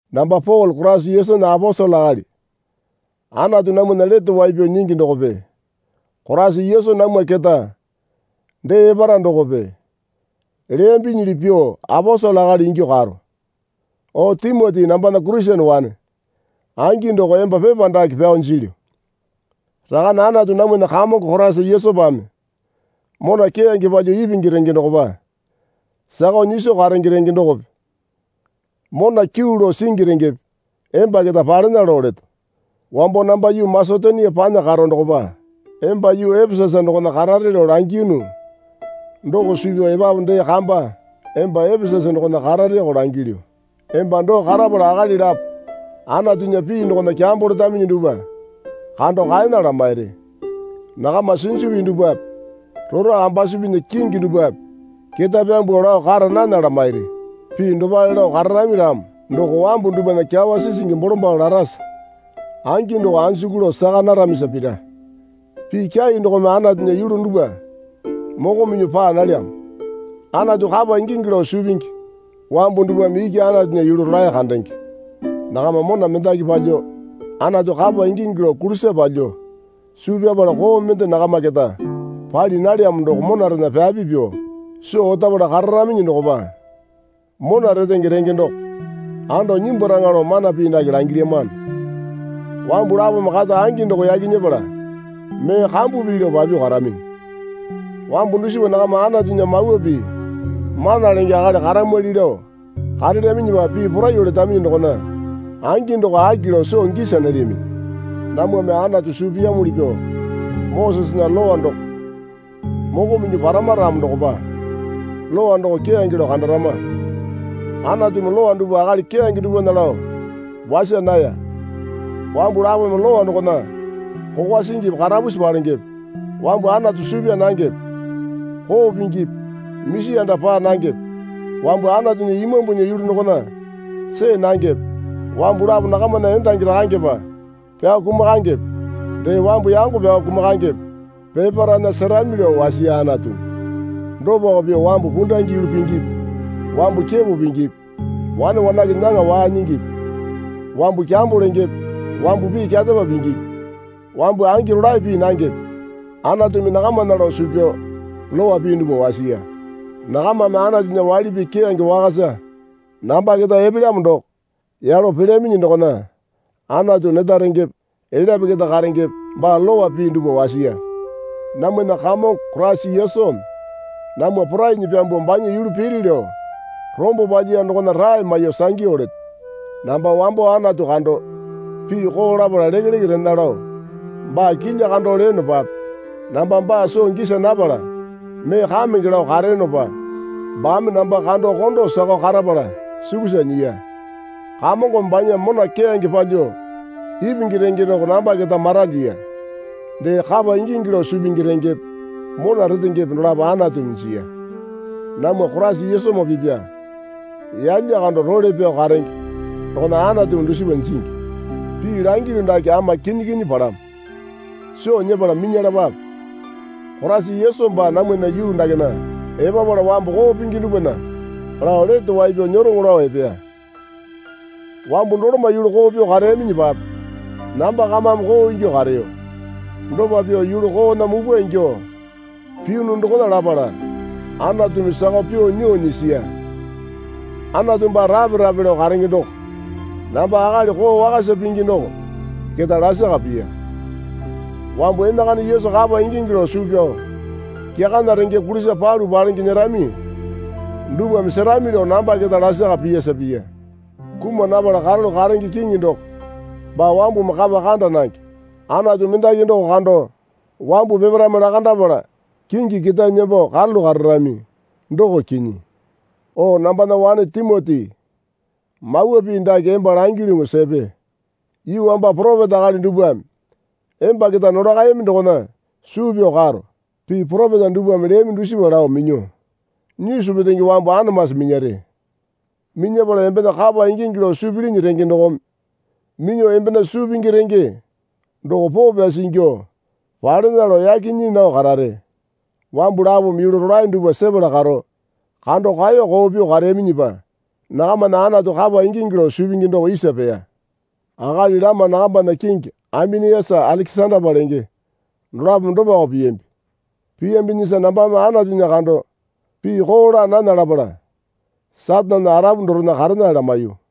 Namba Pole Koraisa Yesunya aposele akali Anatu namwana Lete Wai Pyao Nyingi dokope Koraisa Yesu namwa keta dee epara dokope leyambinyili pyuo aposele akali ingyuo karo. O Timoti nambana Kurisene wane angi doko emba pepa dake pyao jilyu. Rakane Anatu namwana Kamongo Koraisa Yesupame mona keyange palyuo ipingi renge dokopa sakao nyiso karenge renge dokope mona kyuu lao singi rengepe emba keta palena lao leto. Wambo namba yuu Masetonia panya karo dokopa emba yuu Epesasa dokona karare lao langiyunu doko suu pyao epapu dee kamba emba Epesasa dokona karareko langilyu. Emba doo karapala akali lapo Anatunya pii dokona kyambo letaminyi dupwa kando kaena lamairi. Nakama sinju pii dupwape rora ambasupinya kingi dupwape ketae pyambuo lao kara nana lamairi. Pii dopale lao kararami ramo doko wambu dupwana kyawa sisingi bolombalo larasa angi doko anjuku lao saka naramisa pira. Pii kyai dokome Anatunya yulu dupwa moko minyuo paa nalyamo. Anatu kapa ingingi lao suu pingi wambu dupwame iki Anatunya yulu rolae kandenge. Nakama mona mendaki palyuo Anatu kapa ingingi lao kulisa palyuo suu pyapala koo mende nakama keta pali nalyamo doko monarena pyapi pyuo soo otapala kararaminyi dokopa mona retenge renge doko ando nyimbwaraŋa lao mana pii dake langilyamano. Wambu lapome kata angi doko yaki nyepala mee kambu pii lao papyuo karaminyi. Wambu dusipa nakama Anatunya mawa pii mana lenge akali karamwali lao karelyaminyipape pii poraiyuo letaminyi dokona angi doko aki lao soo gisa nalyaminyi. Namwame Anatu suu piyamuli pyuo Mosesena Lowa doko moko minyuo parama ramo dokopa Lowa doko keyange lao kandarama. Anatumi lowa dupwa akali keyange dupwana lao wasa naya. Wambu lapome lowa dokona kokwa singipi karapusi palengepe wambu Anatu suu pyaa nangepe koo pingipi misi anda paa nangepe wambu Anatunya Imambunya yulu dokona see nangepe wambu lapo nakamana endangi rakangepa pyao kumakangepe dee wambu yango pyao kumakangepe peparaena serami lao wasiya Anatumi. Dopako pyuo wambu pundange yulu pingipi wambu kepo pingipi wane wanake nyaŋa waa nyingipi wambu kyambo lengepe wambu pii kyarepa pingipi wambu angi rolae pii nangepe Anatumi nakamana lao suu pyao lowa pii dupwa wasiya. Nakamame Anatunya waili pii keyange wakasa namba keta epelyamo doko yalo pelyaminyi dokona Anatu neta rengepe elyape keta karengepe baa lowa pii dupwa wasiya. Namwana Kamongo Koraisa Yesumi namwa porainyi pyambuo banya yulu piri lao rombo palyiya dokona rae maiyuo sangyu leto. Namba wambo Anatu kando pii koo lapala lekeleke rena lao baa kilya kando leyonopape namba baa soo gisa napala mee kamenge lao kareyonopa baame namba kando kondo sakao karapala sukusa nyiya. Kamongome banya mona keyange palyuo ipingi renge doko namba keta maralyiya. Dee kapa ingingi lao suu pingi rengepe mona retengepe dolapo Anatumi jiya. Namwa Koraisa Yesumoo pipya yalya kando role pyao karenge dokona Anatumi dusipa jingi. Pii langilyu dake ama kinyi kinyi palamo. Soo nyepala minyalapape. Koraisa Yesu baa namwana yuu dakena epapala wambu koo pingi dupwana lao lete wai pyao nyeroŋo lao epeya. Wambu doloma yulu koo pyuo kareyaminyipape namba kamame koo ingyuo kareyo. Dopa pyuo yulu koona mupwa ingyuo piyunu dokona lapala Anatumi sakao pyuo nyuo nyisiya. Anatu baa rape rape lao karenge doko namba akali koo wakasa pingi doko keta lasaka piya. Wambu enakana Yesu kapa ingingi lao suu pyao kyakana renge kulisa palu palenge nyerami dupwame serami lao namba keta lasaka piyasa piya. Kuma napala karalu karenge Kiŋi doko baa wambumi kapa kanda nange Anatu mendaki doko kando wambu peparaeme lakandapala kingi ketae nembo karalu kararami doko kinyi. O nambana wane Timoti mawa pii dake emba langilyuŋu sepe. Yuu wamba poropeta akali dupwame emba keta nolakayami dokona suu pyao karo. Pii poropeta dupwame leyami dusipa lao minyuo nyisu petenge wambu anamasi minyare. Minyapala embena kapa ingingi lao suu pilini renge dokome minyuo embena suu pingi renge doko poo pyasi ingyuo palena lao yaki nyii nao karare. Wambu lapome yulu rolae dupwa sepala karo kando kaeyo koo pyuo kareyaminyipa nakamana Anatu kapa ingingi lao suu pingi doko isa peya. Akali lama nakambana kingi Aimeniasa Alekesandapa lenge dolapome dopako piyambi. Piyambinyisa nambame Anatunya kando pii koo laa nana lapala Satanena arapu dorena karena lamaiyu.